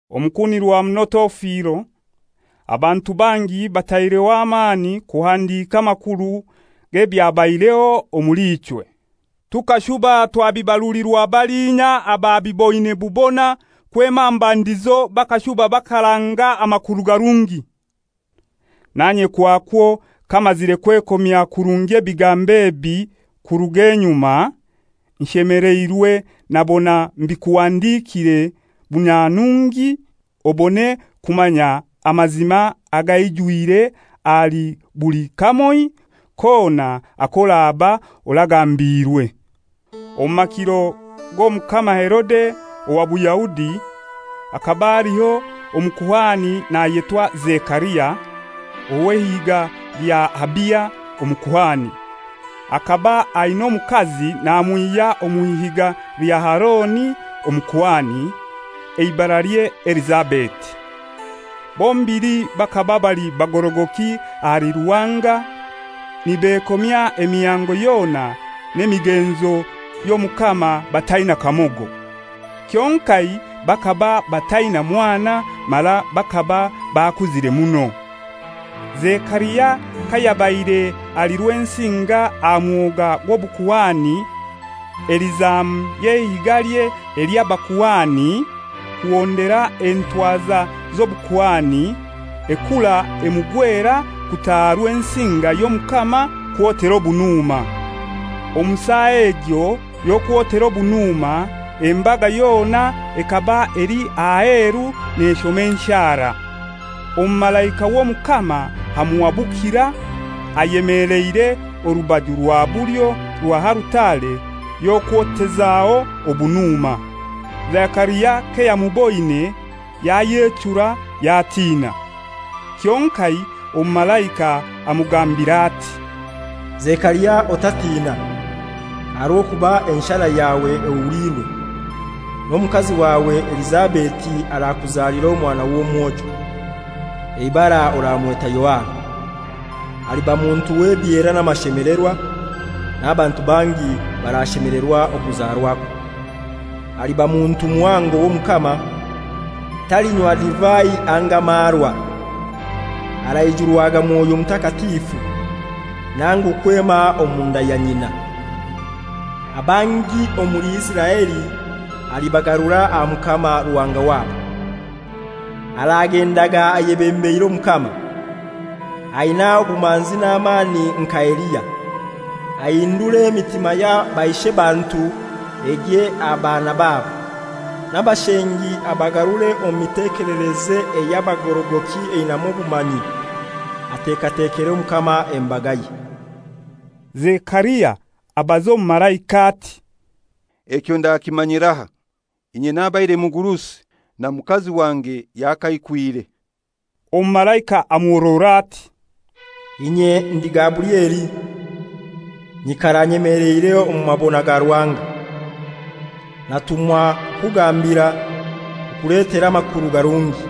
Omukunirwa muno Teofilo, abantu bangi bataireho amani kuhandika amakuru g'ebyabaireho omuli ichwe. Tukashuba twabibarulirwa balinya ababiboine bubona kwema aha mbandizo bakashuba bakaranga amakuru garungi. Nanye kwakwo kamazire kwekomya kurungi ebigambo ebi kuruga enyuma, nshemeleirwe nabona mbikuhandikire bunyanungi, obone kumanya amazima agaijwire ahali buli kamoi kona ak'oraba oragambiirwe. Omu makiro g'Omukama Herode owa Buyahudi, hakaba haliho omukuhani nayetwa Zekaria, ow'eihiga lya Abiya omukuhani. Akaba aina omukazi namwihya omw'ihiga lya Aroni omukuhani, eibaralye Elizabeti. Bombili bakaba bali bagorogoki ahali Ruhanga, nibekomya emihango yona n'emigenzo y'Omukama bataina kamogo. Kyonkai bakaba bataina mwana, mara bakaba bakuzire muno. Zekaria kayabaire ali Rwensinga aha mwoga gw'obukuhani eli zamu y'eihigalye ely'abakuhani, kuhondera entwaza z'obukuhani, ekuura emugwera kutaaha Rwensinga y'Omukama kwotera obunuma. Omu saa egyo y'okwotera obunuma, embaga yona ekaba eli aheru neshoma enshara. Omumalaika w'Omukama amuhabukira, ayemeleire orubaju rwa bulyo rwa alutare y'okwotezaho obunuma. Zekaria kayamuboine yayechura, yatina. Kyonkai omumalaika amugambira ati, «Zekaria otatiina, aha rw'okuba enshara yawe ehuliirwe, n'omukazi wawe Elizabeti arakuzalira omwana w'omwojo, eibara oramweta Yohana. Aliba muntu w'ebyera n'amashemelerwa, n'abantu bangi barashemelerwa okuzarwakwe. Aliba muntu muhango w'Omukama, talinywa divai anga marwa, araijurwaga Mwoyo Mutakatifu, nangu kwema omunda ya nyina. Abangi omuli Isiraeli alibagarura aha Mukama Ruhanga wabo. Aragendaga ayebembeire Omukama, aina obumanzi n'amani nka Eliya, ahindure emitima ya baishebantu egye aha baana babo, n'abashengi abagarure omu mitekelereze ey'abagorogoki einamu obumanyi, atekatekere Omukama embagaye.» Zekaria abaza omumalaika ati, «Ekyo ndakimanyirahai? Inye nabaire mugurusi, na mukazi wange yakaikwire.» Omumalaika amuhorora ati, «Inye ndi Gaburieli, nyikara nyemeleire omu mabona ga Ruhanga. Natumwa kukugambira, kukuletera amakuru garungi.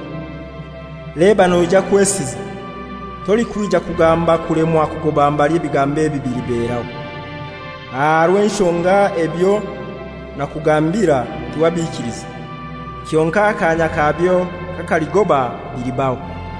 Leba noija kwesiza, tolikwija kugamba kulemwa kugoba mbali ebigambo ebi biliberaho. Aha rw'enshonga ebyo nakugambira tiwabiikiliza, Kyonkai akanya kabyo kakaligoba bilibaho.»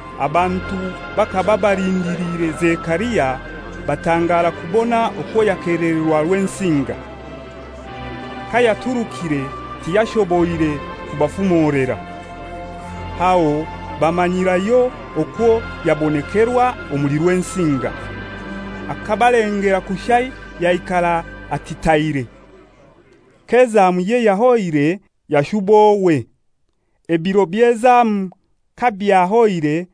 Abantu bakaba balindiliire Zekaria, batangara kubona okwo yakelererwa Rwensinga. Kayaturukire tiyashoboire kubafumolera. Aho bamanyirayo okwo yabonekerwa omuli Rwensinga. Akabalengera kushai yaikara atitaire. K'ezamuye yahoire yashuba owe. Ebiro by'ezamu kabyahoire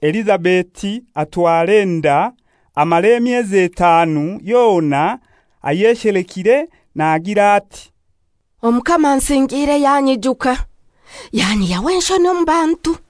Elizabeti atwara enda, amara emyezi etanu yona ayeshelekire, nagira ati, «Omukama ansingiire yanyijuka, yanyihyaho enshoni omu bantu.»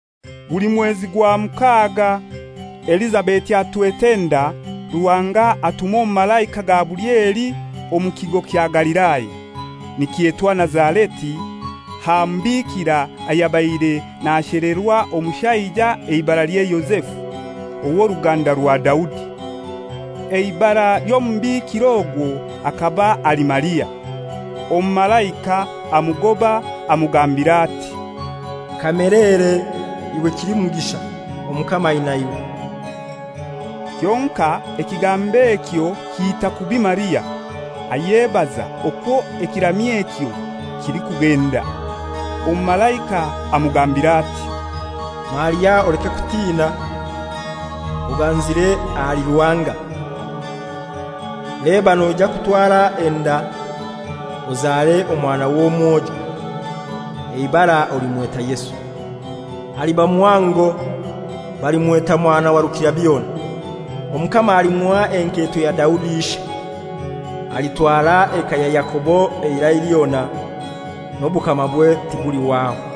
Guli mwezi gwa mukaga Elizabeti atwete enda, Ruhanga atuma Omumalaika Gaburieli omu kigo kya Galilaya, nikyetwa Nazareti, aha mubikira ayabaire nashelerwa omushaija eibaralye Yozefu, ow'oruganda rwa Daudi. Eibara ly'omubikira ogwo akaba ali Maria. Omumalaika amugoba amugambira ati, «Kamelere, iwe kilimugisha, Omukama aina iwe!» Kyonkai ekigambo ekyo kiita kubi Maria, ayebaza okwo ekiramyo ekyo kilikugenda. Omumalaika amugambira ati, «Maria oleke kutina. Oganzire ahali Ruhanga. Leba noija kutwara enda, ozare omwana w'omwojo, eibara olimweta Yesu. Aliba muhango, balimweta Mwana wa Rukirabyona; Omukama alimuha enketo ya Daudi ishe, alitwara eka ya Yakobo eirai lyona, n'obukamabwe tibulihwaho.»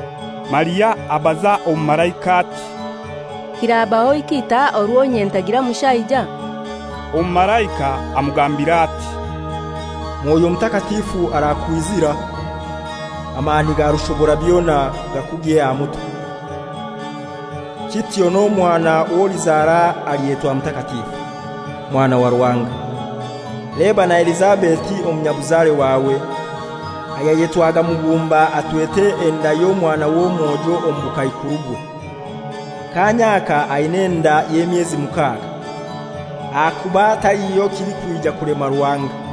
Maria agambira Omumalaika ati, «Kirabaho kitai orwo inye ntagira mushaija?» Omumalaika amugambira ati, «Mwoyo Mutakatifu arakwizira, amani ga Rushoborabyona gakugye aha mutwe, kityo n'omwana w'olizara alyetwa mutakatifu, Mwana wa Ruhanga. Leba na Elizabeti omunyabuzare wawe, ayayetwaga mugumba atwete enda y'omwana w'omwojo omu bukaikurubwe; kaanya aka aina enda y'emyezi mukaga. Ahakuba taliho kilikwija kulema Ruhanga.»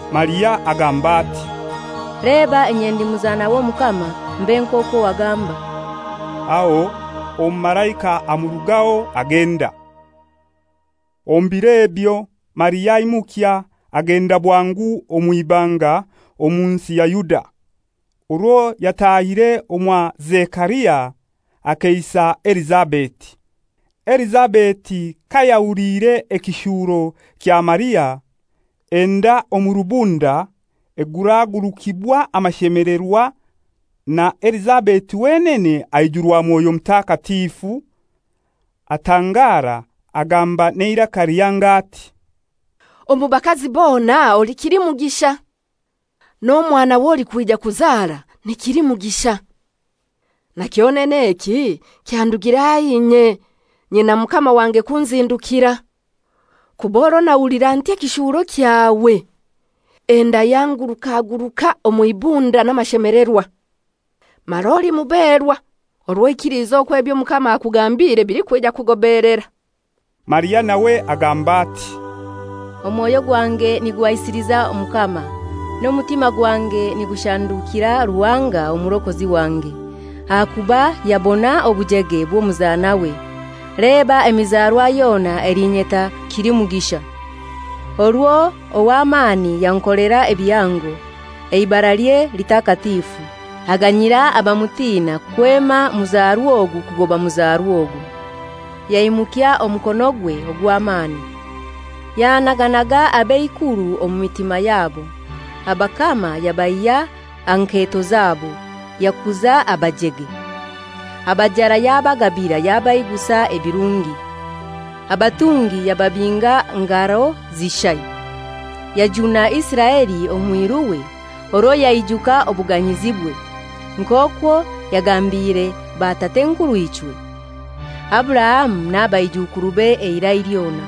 Maria agamba ati, «Leba inye ndi muzana w'Omukama, mbe nk'okwo wagamba.» Aho omumalaika amurugaho agenda. Omu biro ebyo Maria aimukya, agenda bwangu omw'ibanga, omu nsi ya Yuda. Orwo yatahire omwa Zekaria, akeisa Elizabeti. Elizabeti kayahuliire ekishuuro kya Maria, enda omu rubunda eguragurukibwa amashemelerwa, na Elizabeti wenene aijurwa Mwoyo Mutakatifu, atangara, agamba n'eiraka lihango ati, «Omu bakazi bona oli kilimugisha, n'omwana w'olikwija kuzara ni kilimugisha! Na kyonene eki kyandugirahai inye nyina mukama wange kunzindukira? Kuba orwo nahulira nti ekishuuro kyawe, enda yanguraguruka omw'ibunda n'amashemelerwa. Mara oli muberwa orwo oikilize okwo eby'Omukama akugambiire bilikwija kugobeelera.» Maria nawe agamba ati, «Omwoyo gwange niguhaisiliza Omukama, n'omutima gwange nigushandukira Ruhanga Omurokozi wange, ahakuba yabona obujege bw'omuzanawe. Leba emizarwa yona elinyeta kilimugisha. Orwo ow'amani yankolera ebihango, eibaralye litakatifu. Aganyira abamutina, kwema muzarwa ogu kugoba muzarwa ogu. Yaimukya omukonogwe ogw'amani, yanaganaga ab'eikuru omu mitima yabo. Abakama yabaihya aha nketo zabo, yakuza abajege. Abajara yabagabira, yabaigusa ebirungi; abatungi yababinga ngaro zishai. Yajuna Isiraeli omwiruwe, orwo yaijuka obuganyizibwe, nk'okwo yagambiire batat'enkurw'uichwe, Aburahamu na baijukurube eirai lyona.»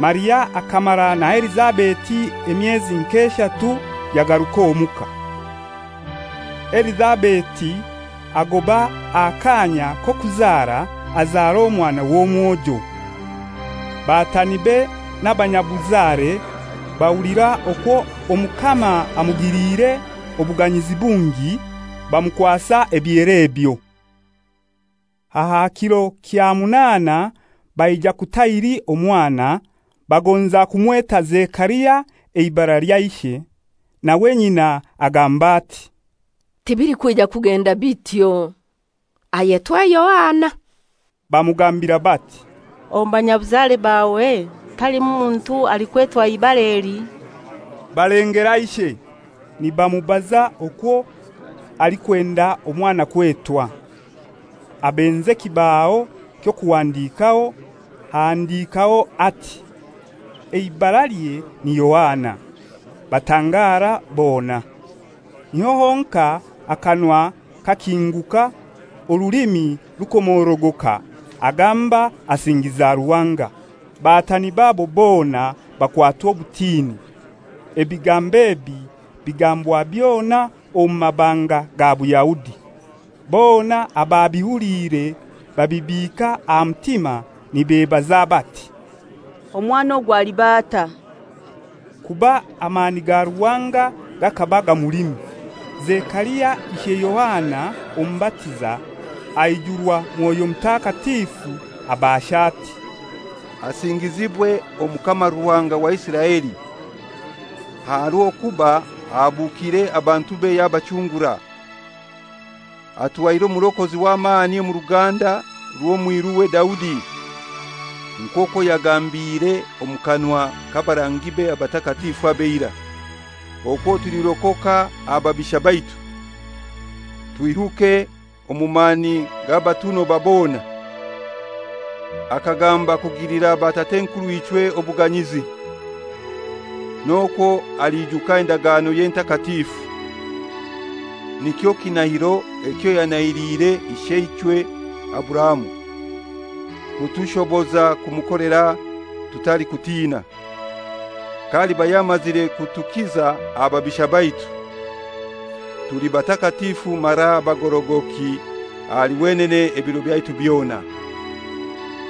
Maria akamara na Elizabeti emyezi nk'eshatu yagaruka omuka. Elizabeti agoba aha kaanya k'okuzara, azara omwana w'omwojo. Batanibe n'abanyabuzare bahulira okwo Omukama amugilire obuganyizi bungi, bamukwasa ebyera ebyo. Aha kiro kya munaana baija kutahiri omwana, bagonza kumweta Zekaria eibara lya ishe. Nawe nyina agamba ati, «Tibilikwija kugenda bityo. Ayetwe Yohana.» Bamugambira bati, «Omu banyabuzare bawe talimu muntu alikwetwa ibara eli.» Balengera ishe, nibamubaza okwo alikwenda omwana kwetwa. Abenza ekibaho ky'okuhandikaho, ahandikaho ati, «Eibaralye ni Yohana.» Batangara bona. Niho honkai akanwa kakinguka, orulimi rukomorogoka, agamba asingiza Ruhanga. Batani babo bona bakwatwa obutini. Ebigambo ebi bigambwa byona omu mabanga ga Buyahudi. Bona ababihuliire babibiika aha mutima nibebaza bati, «Omwana ogu aliba atai?» Kuba amani ga Ruhanga gakaba gamulimu. Zekaria ishe Yohana Omubatiza, aijurwa Mwoyo Mutakatifu, abaasha ati, «Asingizibwe Omukama Ruhanga wa Isiraeli, aha rw'okuba ahabukiire abantube yabachungura. Atuhaire Omurokozi w'amani omu ruganda rw'omwiruwe Daudi, nk'okwo yagambiire omu kanwa k'abarangibe abatakatifu ab'eirai, okwo tulirokoka aha babisha baitu, twihuke omu mani g'abatunoba bona; akagamba kugilira batat'enkurw'uichwe obuganyizi, n'okwo aliijuka endaganoye entakatifu, nikyo kinahiro ekyo yanahiliire isheichwe Aburahamu, kutushoboza kumukolera tutalikutina, k'aliba yamazire kutukiza aha babisha baitu, tuli batakatifu mara abagorogoki ahali wenene ebiro byaitu byona.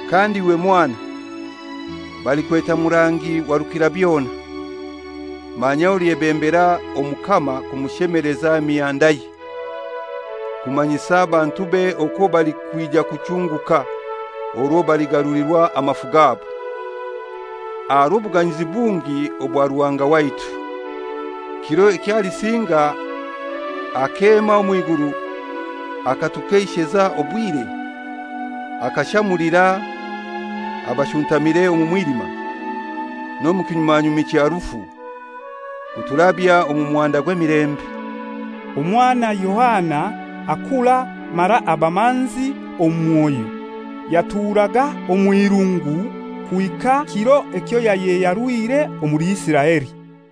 Kandi iwe mwana, balikweta murangi wa Rukirabyona; manya olyebembera Omukama kumushemeleza emihandaye, kumanyisa abantube okwo balikwija kuchunguka orwo baligarulirwa amafu gabo, aha rw'obuganyizi bungi obwa Ruhanga waitu, kiro eky'alisinga akeema omw'iguru akatukeisheza obwire, akashamulira abashuntamire omu mwilima, n'omu kinyumanyumi kya rufu, kuturabya omu muhanda gw'emilembe.» Omwana Yohana akura mara aba manzi omu mwoyo. Yaturaga omw'irungu kuhika kiro ekyo yayeyarwire omuli Isiraeli.